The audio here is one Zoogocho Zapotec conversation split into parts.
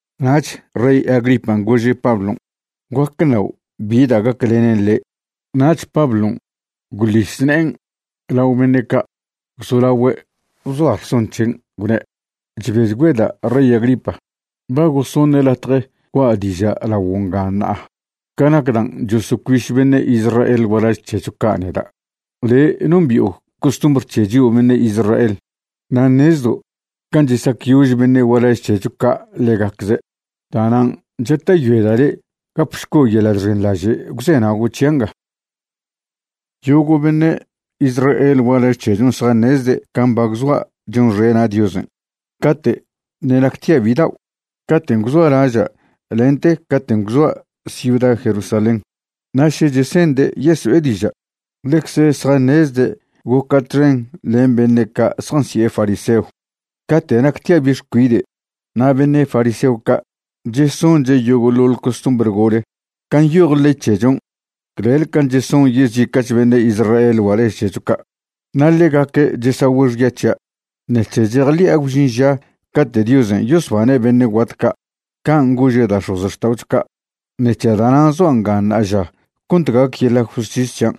Nach rey Agripan' gože' Pablon': ―Guac ṉao' bi da' gaclenen le'. Nach Pablon' gwḻis ne'en lao beṉe' ca' gwzolagüe' bzoa rson c̱hen', gwne': ―Chbechgüeda' rey Agripa, ba gosoṉe' latje gua' diža' laguo' nga ṉa'a ca nac dan' chosocuiš beṉe' Israel gualaž c̱hecho ca' neda'. Le' nombi'o costumbr c̱he chio' beṉe' Israel na' ṉezdo' can' chesacyož beṉe' gualaž c̱hecho ca' ḻegacze'. Da'nan' chata'yoeda' le' gapšco' yeḻa' chxenḻaže' gwzenago' c̱hia' nga. ’Yogo' beṉe' Israel gualaž c̱hechon' zjaṉezde' can' ba gwzoa' chonxena' Diosen' cate' ṉe' nactia' bidao', caten' gwzoa' laža' lente caten' gwzoa' ciuda Jerusalén. Na' še chese'nde' yeso'e diža', ḻecze zjaṉezde' goca' txen len beṉe' ca' zjansi'e fariseo cate' nactia' bi' xcuide' na' beṉe' fariseo ca' chesonche' yogoḻoḻ costumbr gole can' nyoj ley c̱hechon' clel can' cheson yezica'ch beṉe' Israel gualaž c̱hecho ca'. Na' ḻegaque' chesagüe' xya c̱hia' ṉec̱he chejḻi'a gwžin ža cate' Diosen' yosbane' beṉe' guat ca' can' gože' da' x̱ozxta'ocho ca'. Ṉec̱he da'nan' zoa' nga ṉa'aža cont gac yeḻa' justis c̱hian'.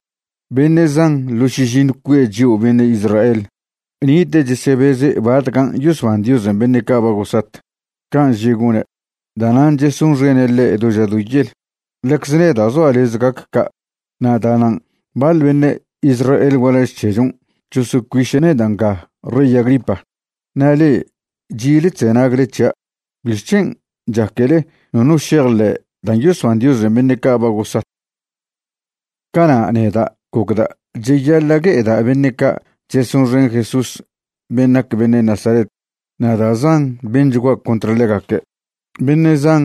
Beṉe' zan ḻo šižiṉw cue' chio' beṉe' Israel nite' chesebeze' batcan' yosban Diosen' beṉe' ca' ba gosat, can' že' gone'. Da'nan' chesonxene' ḻe' do ža do yel. Ḻecz neda' zoa' lez gac ca', na' da'nan' baḻ beṉe' Israel gualaž c̱hechon' chosocuiše' neda' nga rey Agripa. Na' le'e chi'le chzenagle c̱hia', ¿bixc̱hen' chaquele nono šejḻe' dan' yosban Diosen' beṉe' ca' ba gosat? ’Cana' neda' gocda' cheyaḻa' gue'eda' beṉe' ca' chesonxen Jesús ben' nac beṉe' Nazaret, na' da' zan benchgua' contr ḻegaque'. Beṉe' zan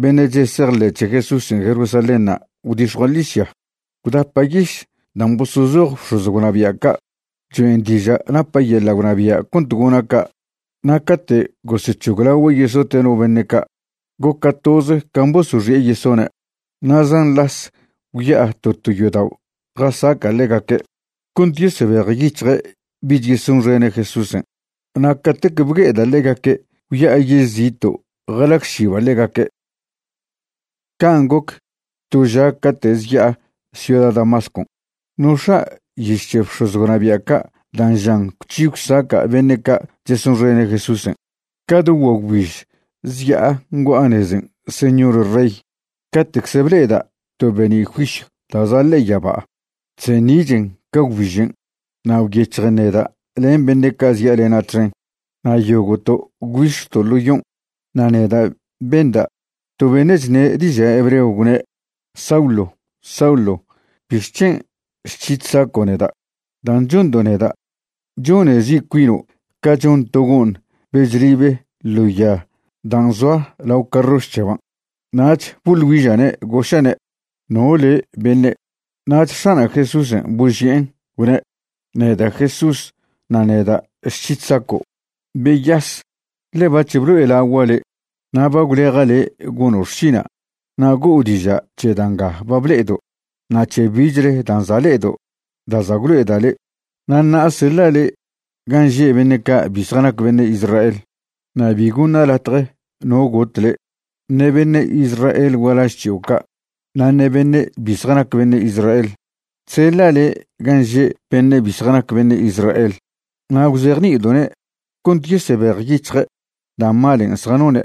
beṉe' chesejḻe' c̱he Jesúsen' Jerusalénṉa' gwdix̱jua' ḻižya, gwdapa' yiš dan' bosozoj bx̱oz gwnabia' ca' cho'en diža' napa' yeḻa' gwnabia' cont gona' ca'. Na' cate' gosec̱hoglagüe' yesote' no beṉe' ca', goca' toze can' bosoxi'e yesone'. Na' zan las gwya'a to to yodao' jasaca' ḻegaque' cont yesebejyic̱hje' bich yesonxene' Jesúsen'. Na' catec bgue'eda' ḻegaque' gwya'a yež zito' jalagšiba' ḻegaque'. ’Can' goc to ža cate' zya'a ciuda Damascon', nox̱a' yiš c̱he bx̱oz gwnabia' ca' dan' žan gwc̱hi gwsaca' beṉe' ca' chesonxene' Jesúsen'. Ca do guagwbiž zya'a ngua'a nezen' señor rey, cate'cze ble'eda' to be'ni' juisyw da' za' ḻe'e yaba, chseṉi'chen ca gwbižen', na' gwyec̱hjen neda' len beṉe' ca' zya'alena' txen. Na' yogo'to' gwbix̱to' ḻo yon', na' neda' benda' to beṉe' chṉe' diža' hebreo gwne': “Saulo, Saulo ¿bixc̱hen' chc̱hi chsaco' neda'? Dan' chondo' neda', chone zi' cuino' ca chon to go'ṉ be chlibe ḻo ya dan' zoa lao carroš c̱heban'.” Nach boḻ güiža'ne', goža'ne': “¿No le' beṉe'?” Nach X̱ana' Jesúsen' boži'en, gwne': “Neda' Jesús na' neda' chc̱hi chsaco'. Beyas, ḻe bac̱h blo'elagua' le' na' ba gwleja' le' gono' xšina' na' go'o diža' c̱he da' nga ba ble'edo' na' c̱he bichle dan' za' le'edo' da' za' gwlo'eda' le'. Na' ṉa'a seḻa' le' gan' že' beṉe' ca' bi zjanac beṉe' Israel. Na' bi goṉa' latje no got le', ṉe beṉe' Israel gualaž c̱hio' ca' na' ṉe beṉe' bi zjanac beṉe' Israel. Chseḻa' le' gan' že' beṉe' bi zjanac beṉe' Israel na' gwzejni'ido'ne' cont yesebejyic̱hje' da' malen' zjanone'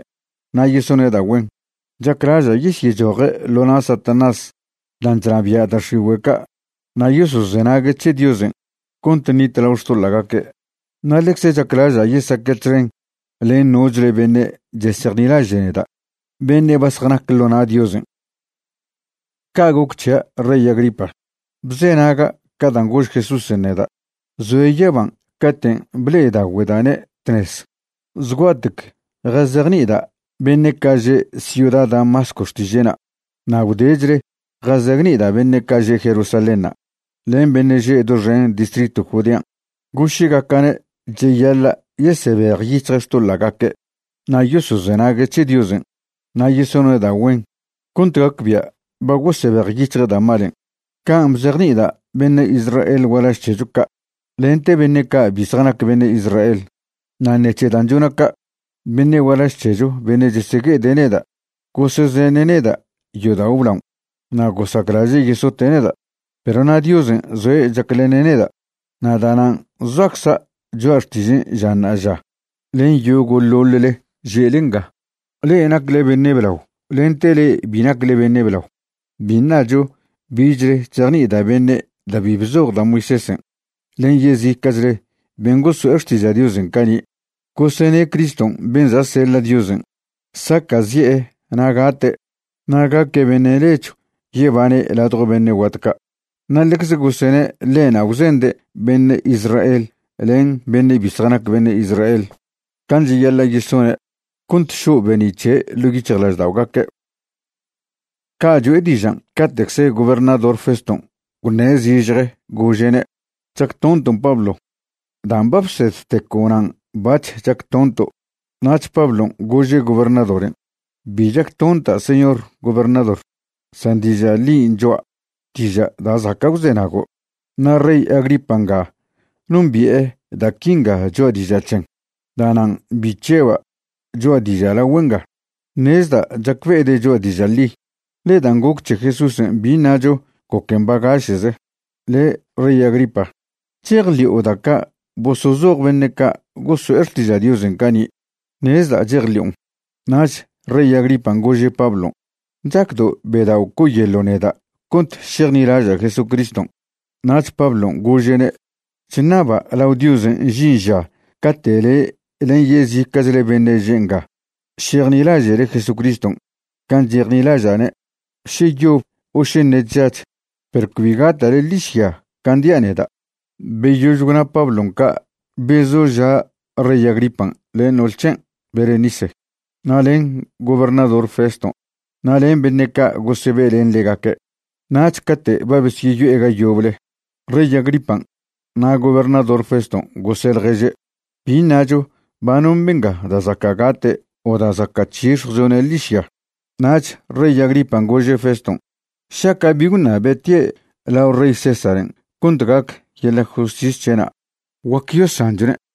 na' yesone' da' güen. Chaclaža' yesyechoje' ḻo na' Satanás dan' chnabia' da' x̱igüe' ca' na' yosozenague' c̱he Diosen' cont ṉitlao xtoḻa'gaque', na' ḻecze chaclaža' yesaque' txen len nochle beṉe' chesejnilaže' neda' beṉe' ba zjanac ḻo na' Diosen'.” ’Ca' goc c̱hia' rey Agripa, bzenaga' ca dan' gož Jesúsen' neda' zoe' yaban' caten' ble'edagüeda'ne' tnez. Zgua'tec jazejni'ida' beṉe' ca' že' ciuda Damasco xtiže'na' na' gwdechle jazejni'ida' beṉe' ca' že' Jerusalénṉa' len beṉe' že' doxen distritw Judean', goše'gaca'ne' cheyaḻa' yesebejyic̱hje' xtoḻa'gaque' na' yosozenague' c̱he Diosen' na' yesone' da' güen cont gacbia' ba gosebejyic̱hje' da' malen'. Can' bzejni'ida' beṉe' Israel gualaž c̱hecho ca' lente beṉe' ca' bi zjanac beṉe' Israel. Na' ṉec̱he dan' chona' ca', beṉe' gualaž c̱hecho beṉe' chesegue'ede' neda' gosezene' neda' yodao' blaon' na' gosaclaže' yesote' neda'. Perw na' Diosen' zoe' chaclene' neda', na' da'nan' zoacza' cho'a xtižen' ža ṉa'aža len yogo'ḻoḻle že'le nga, le'e nacle beṉe' blao lente le'e bi nacle beṉe' blao. Bi ṉacho bichle chzejni'ida' beṉe' da' bi bzoj da' Moisésen' len yezica'chle ben' goso'e xtiža' Diosen' cani'. Gosene' Criston' ben' za' seḻa' Diosen' saca'zi'e na' gate' na' gaque' beṉe' nechw yebane' ladjo beṉe' guat ca'. Na' ḻecz gosene' ḻe'na' gwzende' beṉe' Israel len beṉe' bi zjanac beṉe' Israel can' cheyaḻa' yesone' cont šo' be'ni' c̱he' ḻo' yic̱hjlažda'ogaque'. Ca' cho'e dižan' cate'cze gobernador Feston' gwṉe' zižje gože'ne': ―¡Chactonton' Pablo! Dan' ba bsedteco' nan' bac̱h chactonto'. Nach Pablon' gože' gobernadoren': ―Bi chactonta' señor gobernador, san diža' ḻin' cho'a, diža' da' zaca' gwzenago'. Na' rey Agripa nga nombi'e da' quinga choa' diža' c̱hen, da'nan' bi chžeba' choa' diža' lagüe' nga. Ṉezda' chacbe'ede' choa' diža' ḻi, ḻe dan' goc c̱he Jesúsen' bi ṉacho goquen bagaše'ze. Le' rey Agripa, ¿chejḻi'o da' ca' bosozoj beṉe' ca' goso'e xtiža' Diosen' cani'? Ṉezda' chejḻi'on. Nach rey Agripan' gože' Pablon': ―¿Chacdo' bedao' co'oyeḻo' neda' cont šejnilaža' Jesucriston'? Nach Pablon' gože'ne': ―Chṉaba' lao Diosen' žin ža cate' le' len yezica'chle beṉe' že' nga šejnilaže'le Jesucriston' can' chejnilaža'ne', še yob o še ṉe' chžach, perw cbi gata'le ḻižya can' dia' neda'. Beyož gwna Pablon' ca' bezoža' rey Agripan' len no'ol c̱hen' Berenice, na' len gobernador Feston' na' len beṉe' ca' gosebe' len ḻegaque'. Nach cate' ba besyeyo'e ga yoble, rey Agripan' na' gobernador Feston' gose' ḻježe': ―Bi ṉacho ba non benga da' zaca' gate' o da' zaca' c̱hix̱jwchone' ḻižya. Nach rey Agripan' gože' Feston': ―Šaca' bi gwṉabe' tie' lao rey Césaren' cont gac yeḻa' justis c̱he'na' guac yosanchone'.